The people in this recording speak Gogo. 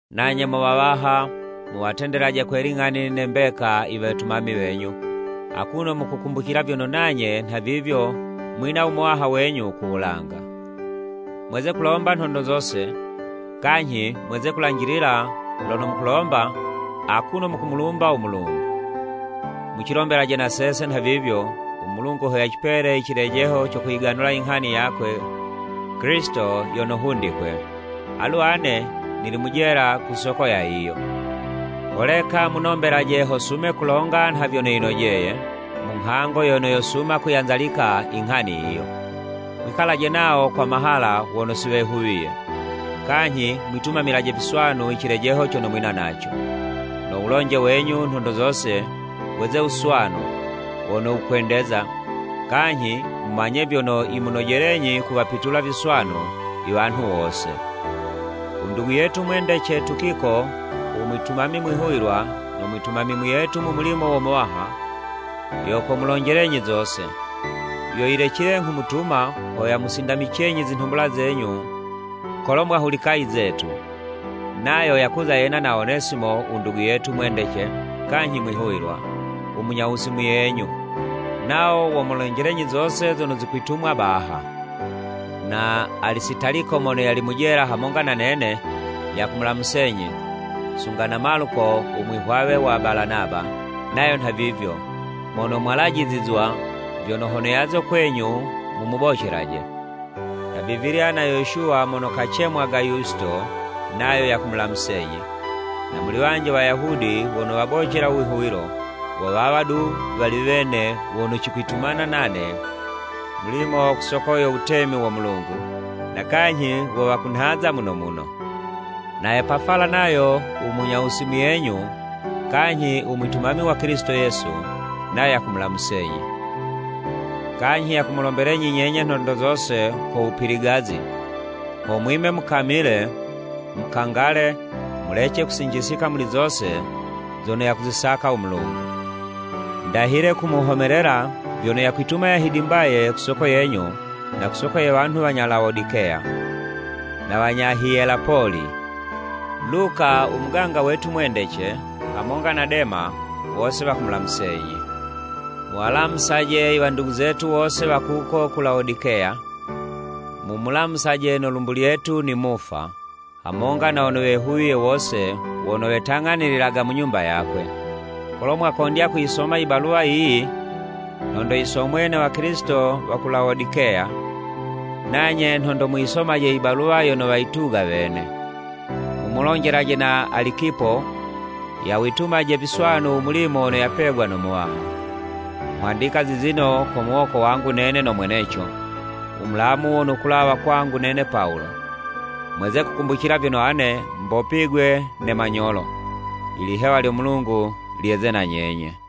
Nanye mo wawaha, muwatendelaje kwe ling'ani ne mbeka i wetumami wenyu, akuno mukukumbucila vyono nanye nha vivyo mwina u Muwaha wenyu ku wulanga. Mweze kulomba nhondo zose, kanyhi mweze kulanjilila lono mukulomba, akuno mukumulumba u Mulungu. Mucilombelaje na sese nhavivyo, u Mulungu ho yacipele i cilejeho co kuyiganulila i nghani yakwe Kilisito yono hundikwe. Alu ane nili mu jela ku soko ya yiyo. Holeka munombelaje ho sume kulonga nha vyono yinojeye, mu nghango yono yosuma kuyanzalika i nghani yiyo. Mwikalaje nawo kwa mahala wono si wehuwiye, kanyhi mwitumamilaje viswanu i cilejeho cono mwina naco. No wulonje wenyu nhondo zose weze wuswanu, wono wukwendeza, kanyhi mumanye vyono yimunojelenyi kuwapitula viswanu i wanhu wose. U ndugu yetu mwendece, Tukiko, u mwitumami mwihuwilwa, no mwitumami muyetu mu mulimo wo Muwaha, yo komulonjelenyi zose. Yo yilecile nghumutuma, ho yamusindamicenyi zinhumbula zenyu kolo mwahulika i zetu. Nayo yakuza yena na Onesimo u ndugu yetu mwendece kanyhi mwihuwilwa, u munyawusi muyenyu. Nawo womulonjelenyi zose zono zikwitumwa baha. Na Alisitaliko mono yali mu jela hamonga na nene, yakumulamusenyi, sunga na Maluko u mwihwawe wa Balanaba, nayo nha vivyo, (Mono mwalajizizwa, vyono hono yaze kwenyu mumubocelaje.) Nhavivilya na Yoshuwa mono kacemwaga Yusito, nayo yakumulamusenyi. Na muli wanji Wayahudi wono wabocela u wihuwilo, wo wawa du wali wene wono cikwitumana nane mulimo ku soko yo wutemi wo Mulungu, na kanyhi wo wakunhaza muno muno. Na Epafala nayo u munyawusi muyenyu, kanyhi u mwitumami wa Kilisito Yesu, nayo yakumulamusenyi. Kanyhi yakumulombelenyi nyenye nhondo zose ko wupiligazi, ho mwime mukamile, mukangale, mulece kusinjisika muli zose zono yakuzisaka u Mulungu. Ndahile kumuhomelela vyono yakwituma yahidimbaye ku soko yenyu na ku soko ye wanhu wanya Lawodikeya, na wanya Hiyelapoli. Luka, u muganga wetu mwendece, hamonga na Dema, wose wakumulamusenyi. Muwalamusaje i wandugu zetu wose wa kuko ku Lawodikeya, mumulamusaje no lumbu lyetu Nimufa, hamonga na wono wehuwiye wose wono wetang'anililaga mu nyumba yakwe. Kolo mwakondya kuyisoma i baluwa yiyi, nhondo yisomwe ne Wakilisito wa ku Lawodikeya, nanye nhondo muyisomaje i baluwa yono wayituga wene. Mumulonjelaje na Alikipo yawitumaje viswanu u mulimo wono yapegwa no Muwaha. Nghwandika zizino ko muwoko wangu nene no mweneco, u Mulamu wono wukulawa kwangu nene Pawulo. Mweze kukumbucila vyono ane mbopigwe ne manyolo. Ilihewa lyo Mulungu lyeze na nyenye.